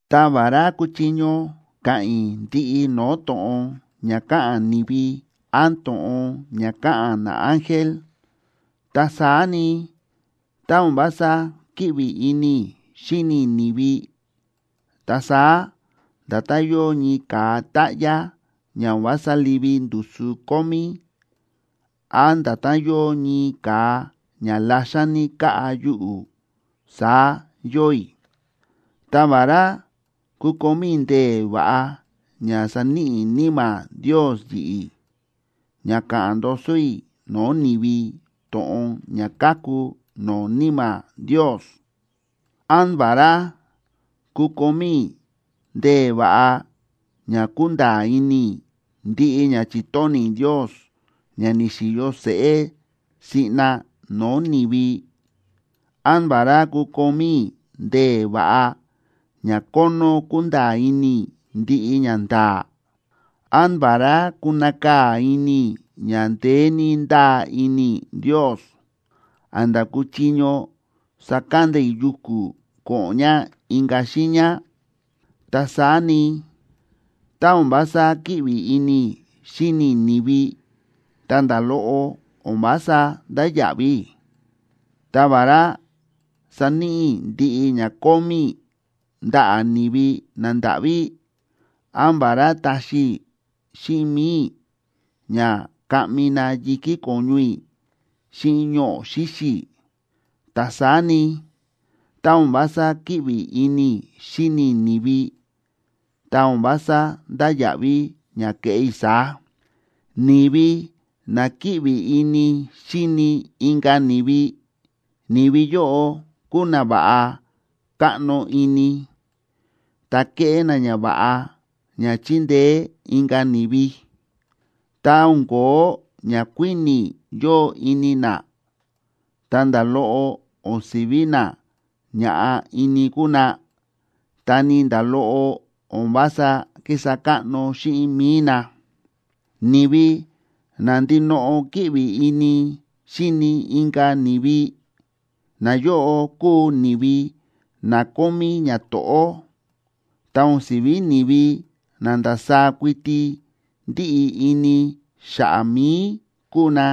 Ta vará kuchiño ka̱ꞌa̱n i̱ ndiꞌi no̱o̱ to̱ꞌon ña káꞌa̱n ni̱vi án to̱ꞌon ña káꞌa̱n naángel, ta saá ni, tá o̱n vása kíꞌvi ini i̱ xíni i̱ ni̱vi, ta saá nda̱tán yóo ñii ka̱a táꞌyá ña o̱n vása livi ndusu kómí, án nda̱tán yóo ñii ka̱a ña laxan ní káꞌa yuꞌu̱, saá yóo i̱. Ta vará kukomí i̱ ndee̱ va̱ꞌa ña sa̱níꞌi Níma̱ Ndios yi̱ꞌi̱ ña káꞌa̱n ndoso i̱ no̱o̱ ni̱vi to̱ꞌon ña káku no̱o̱ Níma̱ Ndios, án vará kukomí i̱ ndee̱ va̱ꞌa ña kúnda̱a̱ ini i̱ ndiꞌi ña chi̱tóni̱ Ndios ña ni̱xi̱yo seꞌé siꞌna no̱o̱ ni̱vi, án vará kukomí i̱ ndee̱ va̱ꞌa ña kónó kúnda̱a̱ ini i̱ ndiꞌi ñanda̱a̱, án vará kunakaa̱ ini i̱ ña ndeé ní ndáa ini i̱ Ndios, a̱nda̱ kúchiño sakanda i̱ yuku̱ ko̱ꞌo̱n ña inka̱ xiiña, ta saá ni, tá o̱n vása kíꞌvi ini i̱ xíni i̱ ni̱vi, ta nda̱ loꞌo o̱n vása ndáya̱ꞌví i̱. Ta vará saníꞌi i̱ ndiꞌi ña kómí i̱ ndaꞌa̱ ni̱vi nandáꞌví, án vará taxi xíꞌin mi̱i i̱ ña kaꞌmi na yi̱kí ko̱ñu i̱ xíꞌin ñoꞌo̱ xíxi̱, ta saá ni, ta o̱n vása kíꞌvi ini i̱ xíni i̱ ni̱vi, ta o̱n vása ndáya̱ꞌví ña keꞌé i̱ saá. Ni̱vi na kíꞌvi ini xíni inka̱ ni̱vi, ni̱vi yóꞌo kúu na va̱ꞌa káꞌno ini, ta kéꞌé na ñava̱ꞌa ña chíndeé inka̱ ni̱vi. Ta o̱n ko̱ó ñakuíni̱ yóo ini na, ta nda̱ loꞌo o̱n si̱ví na ña̱ꞌa ini kúu na, ta ni nda̱ loꞌo o̱n vása kísa káꞌno xíꞌin mi̱i na. Ni̱vi na ndinoꞌo kíꞌvi ini xíni inka̱ ni̱vi, nayóꞌo kúu ni̱vi na kómí ñato̱ꞌó, ta o̱n si̱ví ni̱vi na ndasaá kuiti ndíꞌi ini xa̱ꞌa̱ mi̱i kúu na,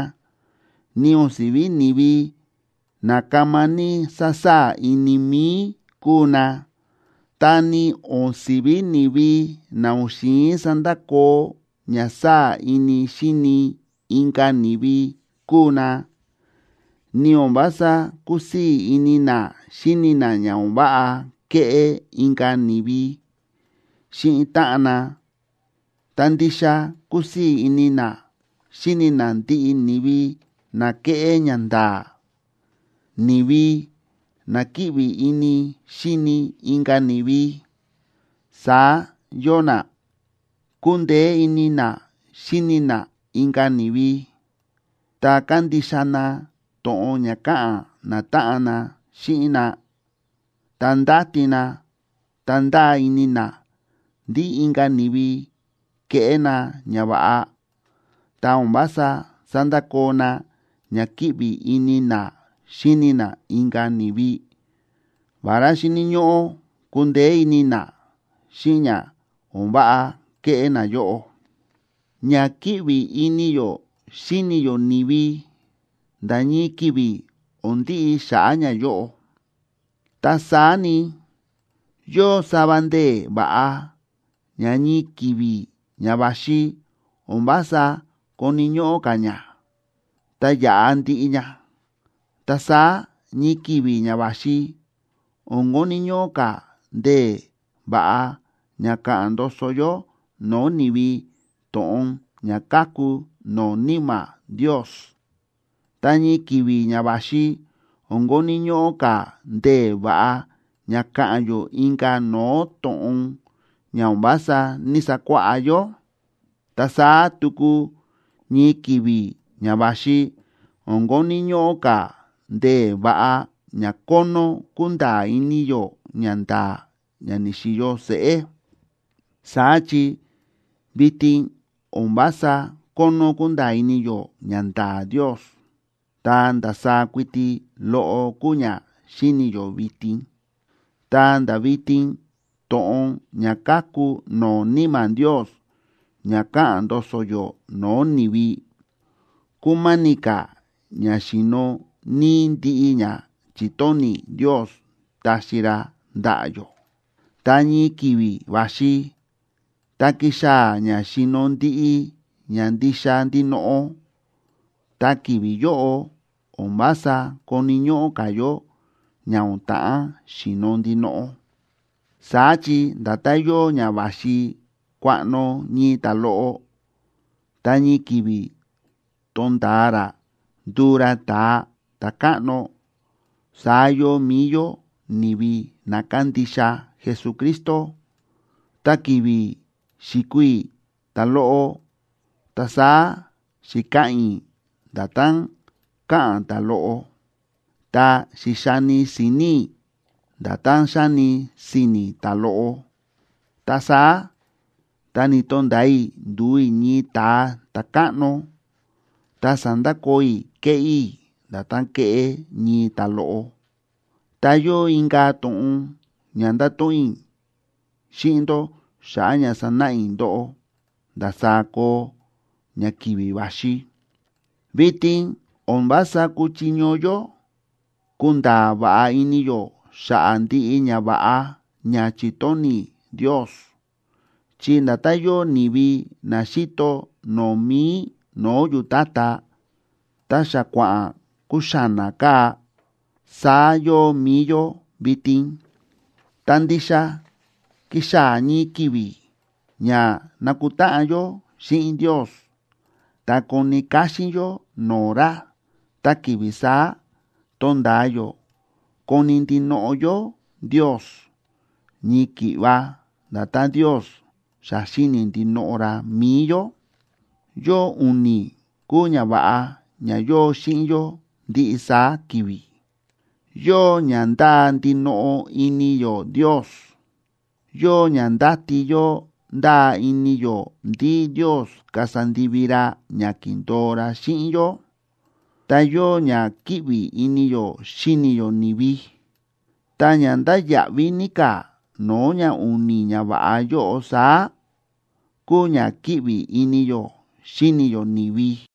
ni o̱n si̱ví ni̱vi na kama ní sásaa̱ ini mi̱i kúu na, ta ni o̱n si̱ví ni̱vi na o̱n xi̱in sandakoo ña sáa̱ ini xíni inka̱ ni̱vi kúu na. Ni o̱n vása kúsii̱ ini na xíni na ña o̱n váꞌa kéꞌé inka̱ ni̱vi xíꞌin táꞌan na, ta ndixa kúsii̱ ini na xíni na ndiꞌi ni̱vi na kéꞌé ñanda̱a̱. Ni̱vi na kíꞌvi ini xíni inka̱ ni̱vi, saá yóo na: Kúndeé ini na xíni na inka̱ ni̱vi, ta kándixa na to̱ꞌon ña káꞌa̱n natáꞌan na xíꞌin na, ta ndáti na ta ndáa ini na ndí inka̱ ni̱vi keꞌé na ñava̱ꞌa, ta o̱n vása sándakoo na ña kíꞌvi ini na xíni na inka̱ ni̱vi, vará xíni̱ ñóꞌó kundeé ini na xíꞌin ña o̱n váꞌa kéꞌé nayóꞌo. Ña kíꞌvi ini yó xíni yó ni̱vi nda̱ ñii ki̱vi̱ o̱n ndiꞌi xa̱ꞌa̱ ñayóꞌo. Ta saá ni, yóo sava ndee̱ va̱ꞌa ña ñii ki̱vi̱ ña va̱xi o̱n vása koni̱ ñóꞌó ka̱ ña, ta yaꞌa ndiꞌi ña. Ta saá ñii ki̱vi̱ ña va̱xi o̱n koni̱ ñóꞌó ka̱ ndee̱ va̱ꞌa ña káꞌa̱n ndoso yó no̱o̱ ni̱vi to̱ꞌon ña káku no̱o̱ Níma̱ Ndios. Ta ñii ki̱vi̱ ña va̱xi o̱n koni̱ ñóꞌó ka̱ ndee̱ va̱ꞌa ña káꞌa̱n yó inka̱ no̱o̱ to̱ꞌon ña o̱n vása ní‑sakuáꞌá yó. Ta saá tuku ñii ki̱vi̱ ña va̱xi o̱n koni̱ ñóꞌó ka̱ ndee̱ va̱ꞌa ña kónó kúnda̱a̱ ini yó ñanda̱a̱ ña ni̱xi̱yo seꞌé. Saá chi vitin o̱n vása kónó kúnda̱a̱ ini yó ñanda̱a̱ Ndios, ta ndasaá kuiti loꞌo kúu ña xíni̱ yó vitin. Ta nda̱ vitin to̱ꞌon ña káku no̱o̱ Níma̱ Ndios ña káꞌa̱n ndoso yó no̱o̱ ni̱vi, kúma̱ni̱ ka̱ ña xi̱no̱ níí ndiꞌi ña chi̱tóni̱ Ndios taxi ra ndaꞌa̱ yó. Ta ñii ki̱vi̱ va̱xi tá kixaa̱ ña xi̱no̱ ndiꞌi ña ndixa ndinoꞌo, ta ki̱vi̱ yóꞌo o̱n vása koni̱ ñóꞌó ka̱ yó ña o̱n ta̱ꞌán xi̱no̱ ndinoꞌo. Saá chi nda̱tán yóo ña va̱xi kuaꞌno ñii ta̱loꞌo, ta ñii ki̱vi̱ tonda̱a ra nduu ra ta̱a ta̱káꞌno, saá yóo mi̱i yó ni̱vi na kándixa Jesucristo. Ta ki̱vi̱ xi̱kuu i̱ ta̱loꞌo, ta saá xi̱ka̱ꞌa̱n i̱ nda̱tán káꞌa̱n ta̱loꞌo, ta xi̱xani si̱ni̱ i̱ nda̱tán xáni si̱ni̱ ta̱loꞌo. Ta saá tá ni̱to̱nda̱a i̱ ndu̱u i̱ ñii ta̱a ta̱káꞌno, ta sa̱ndakoo i̱ kéꞌé i̱ nda̱tán kéꞌé ñii ta̱loꞌo. Ta yóo inka̱ to̱ꞌon ña ndato̱ꞌon i̱ xíꞌin ndó xa̱ꞌa̱ ña sanáꞌa i̱ ndóꞌó ndasaá koo ña ki̱vi̱ va̱xi. Vitin o̱n vása kúchiño yó kunda̱a̱ va̱ꞌa ini yó xa̱ꞌa̱ ndiꞌi ñava̱ꞌa ña chi̱tóni̱ Ndios, chi nda̱tán yóo ni̱vi na xíto no̱o̱ mi̱i no̱o̱ yu̱tátá ta xa kua̱ꞌa̱n kuxána káa, saá yóo mi̱i yó vitin. Ta ndixa kixaa̱ ñii ki̱vi̱ ña nakutáꞌan yó xíꞌin Ndios ta koni káxín yó no̱o̱ ra. Ta ki̱vi̱ saá tonda̱a yó koni̱ ndinoꞌo yó Ndios, ñii ki̱ꞌva nda̱tán Ndios xa xíni̱ ndinoꞌo ra mi̱i yó. Yóo u̱ni̱ kúu ñava̱ꞌa ña yóo xíꞌin yó ndiꞌi saá ki̱vi̱. Yóo ña ndáa ndinoꞌo ini yó Ndios, yóo ña ndáti yó ndáa ini yó ndí Ndios kasa ndivi ra ña ki̱ndo̱o ra xíꞌin yó, ta yóo ña kíꞌvi ini yó xíni yó ni̱vi. Ta ña ndáya̱ꞌví ní ka̱ no̱o̱ ña u̱ni̱ ñava̱ꞌa yóꞌo saá, kúu ña kíꞌvi ini yó xíni yó ni̱vi.